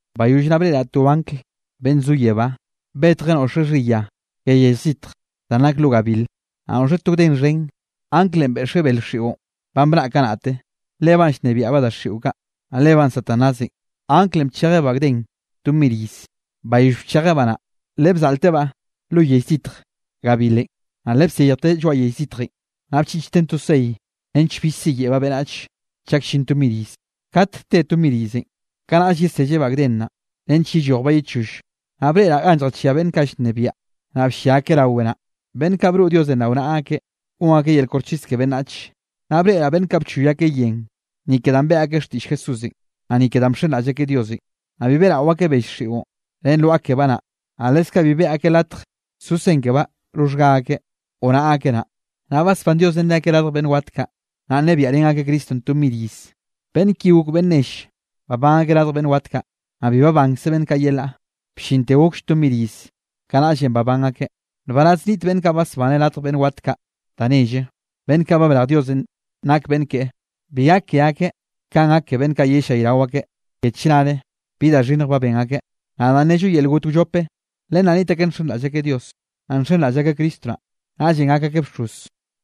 Bayoll naꞌ breꞌraꞌ to angl beꞌnn zo yebá, betjeꞌ noꞌxeꞌ xhiya ke yell zitj danꞌ nak lo gabil, naꞌ noꞌxeꞌ to gden xhen. Anglenꞌ beꞌxeꞌ bel xiꞌon, banꞌ braꞌ kanaꞌte. Lebaꞌ llnebiaꞌbaꞌ daxiꞌo kaꞌ, naꞌ lebaꞌn Satanásenꞌ. Anglenꞌ bchejebaꞌ gden to mir iz. Bayoll bchejebaꞌ naꞌ, le bzaꞌltebaꞌ lo yell zitj gabilenꞌ, naꞌ le bsejteꞌ lloaꞌ yell zitjenꞌ, naꞌ bchiꞌchteꞌn to sey nench bill siyeꞌbaꞌ beꞌnnach chak llin to mir iz. Kat te to mir izenꞌ, kanaꞌll yesellebaꞌ gden naꞌ nench yellojbaꞌ ye choll. Naꞌ breꞌraꞌ ganꞌ lljachia beꞌnn kaꞌ llnebiaꞌ, naꞌ bllia akeꞌ rawe naꞌ, beꞌnn kaꞌ broꞌ Diosenꞌ rao naꞌa akeꞌ gon akeꞌ yel koxchis ke beꞌnnach. Naꞌ breꞌraꞌ beꞌnn kaꞌ bchoy akeꞌ yen, ni ke danꞌ beꞌe akeꞌ xtiꞌll Jesúsenꞌ, naꞌ ni ke danꞌ bxenraꞌll akeꞌ Diosenꞌ, naꞌ bi beꞌrao akeꞌ bell xiꞌon, ren lwaꞌa kebaꞌ naꞌ, naꞌ leskaꞌ bi beꞌe akeꞌ latj so sen kebaꞌ roxhga akeꞌ o naꞌa akeꞌ naꞌ. Naꞌ basbán Diosenꞌ leakeꞌ radj beꞌnn wat kaꞌ, naꞌ nnebiaꞌrén akeꞌ Cristonꞌ to mir iz. Beꞌnn ki gok beꞌnn nell babán akeꞌ radj beꞌnn wat kaꞌ. Naꞌ bi babankze beꞌnn kaꞌ yelaꞌ, bllinte gokll to mir iz, kanaꞌllenꞌ babán akeꞌ. Nbaraz nniꞌt beꞌnn kaꞌ basbaneꞌ radj beꞌnn wat kaꞌ da nelle, beꞌnn kaꞌ ba brej Diosenꞌ nak beꞌnn keꞌe. Bi gak ke akeꞌ kanꞌ gak ke beꞌnn kaꞌ yellayrao akeꞌ ke chnare bi da xhinnj ba ben akeꞌ, da naꞌn nello yel got wllope. Len naꞌ niꞌt akeꞌ nxenraꞌll akeꞌ Dios, naꞌ nxenraꞌll akeꞌ Cristo naꞌ, naꞌllenꞌ gak akeꞌ bxoz,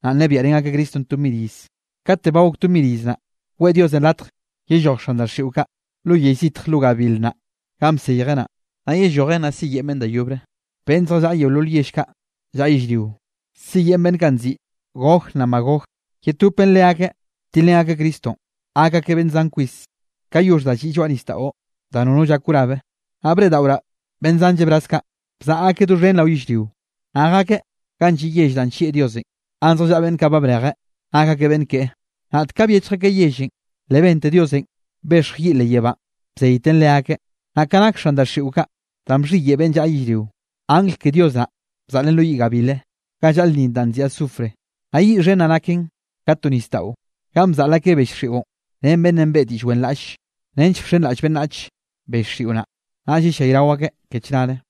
naꞌ nnebiaꞌrén akeꞌ Cristonꞌ to mir iz. Kate ba gok to mir iz naꞌ, weꞌe Diosenꞌ latje yelloj xan daxiꞌo kaꞌ lo yell zitj lo gabil naꞌ, ganꞌ bseyjeꞌ naꞌ. Naꞌ yellojen naꞌ siyeꞌn beꞌnne da yobre, beꞌnn zjallaꞌa yeolol yell kaꞌ llaꞌa yellrio. Siyeꞌn beꞌnn kaꞌ nziꞌi Gog naꞌ Magog, yetopen leakeꞌ tilrén akeꞌ Cristonꞌ, gak akeꞌ beꞌnn zan kwis ka yoxh da lliꞌ lloaꞌ nisdaꞌo, da nono llak wrabe. Naꞌ breꞌdaꞌoraꞌ beꞌnn zan llebraz kaꞌ, bzaꞌa akeꞌ doxhen rao yellrio, naꞌ jakeꞌ ganꞌ lliꞌ yell danꞌ nllieꞌ Diosenꞌ, ganꞌ zjallaꞌa beꞌnn kaꞌ ba brejeꞌ nak akeꞌ beꞌnn keꞌe. Naꞌt ka byechj akeꞌ yellenꞌ, le bente Diosenꞌ bexj yiꞌ leꞌ yebánꞌ bzeyten leakeꞌ. Naꞌ ka nak xan daxiꞌo kaꞌ danꞌ bxhiyeꞌe beꞌnne llaꞌa yellrio, angl ke Dios naꞌ bzaꞌleꞌn lo yiꞌ gabil ganꞌ llaꞌlnninn danꞌ nziꞌi azufre, naꞌ yiꞌ xhen naꞌ naken ka to nisdaꞌo, ganꞌ bzaꞌl akeꞌ bell xiꞌon ren beꞌnnenꞌ beꞌe diꞌll wenraꞌll, nench bxenraꞌll beꞌnnach bell xiꞌo naꞌ. Naꞌll yellayrao akeꞌ ke chnare.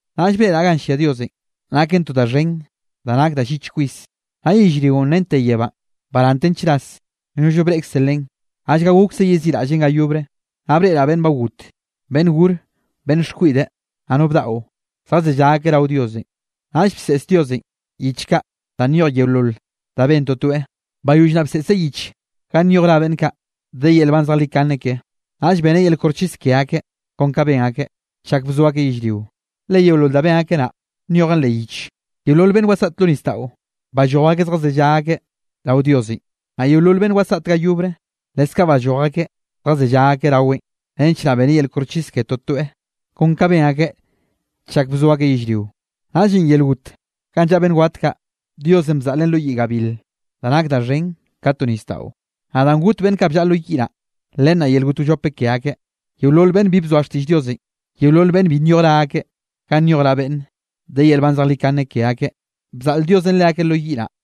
Naꞌll breꞌraꞌ ganꞌ llia Diosenꞌ naken to da xhen da nak da llich kwis. Naꞌ yellrionꞌ rente yebánꞌ baranten chras nollno breꞌkze len, gallga gokse yeziꞌraꞌllen ga yobre. Naꞌ breꞌraꞌ beꞌnn ba got, beꞌnn gore beꞌnn xkwiꞌde, naꞌ no bdaꞌo, zjazellá akeꞌ rao Diosenꞌ. Naꞌll bseꞌs Diosenꞌ yich kaꞌ danꞌ nyoj yeolol da ben totoeꞌ. Bayoll naꞌ bseꞌse yich ganꞌ nyoj ra beꞌnn kaꞌ de yel nban zejlikane ke. Naꞌll beneꞌ yel koxchis ke akeꞌ kon ka ben akeꞌ, chak bzo akeꞌ yellrio, le yeolol da ben akeꞌ naꞌ, nyojen leꞌ yich. Yeolol beꞌnn wasaꞌt lo nisdaꞌon, balloj akeꞌ zjazellá akeꞌ rao Diosenꞌ, naꞌ yeolol beꞌnn wasaꞌt ga yobre, leskaꞌ balloj akeꞌ zjazellá akeꞌ raweꞌn, nench naꞌ beneꞌ yel koxchis ke totoeꞌ kon ka ben akeꞌ chak bzo akeꞌ yellrio. Naꞌllenꞌ yel got ganꞌ llaꞌa beꞌnn wat kaꞌ, Diosenꞌ bzaꞌlen lo yiꞌ gabil danꞌ nak da xhen ka to nisdaꞌo. Naꞌ danꞌ got beꞌnn kaꞌ bllaꞌa lo yiꞌ naꞌ, len naꞌ yel got wllope ke akeꞌ. Yeolol beꞌnn bi bzoa xtiꞌll Diosenꞌ, yeolol beꞌnn bi nyoj ra akeꞌ ganꞌ nyoj ra beꞌnn, de yel nban zejlikane ke akeꞌ, bzaꞌl Diosenꞌ leakeꞌ lo yiꞌ naꞌ.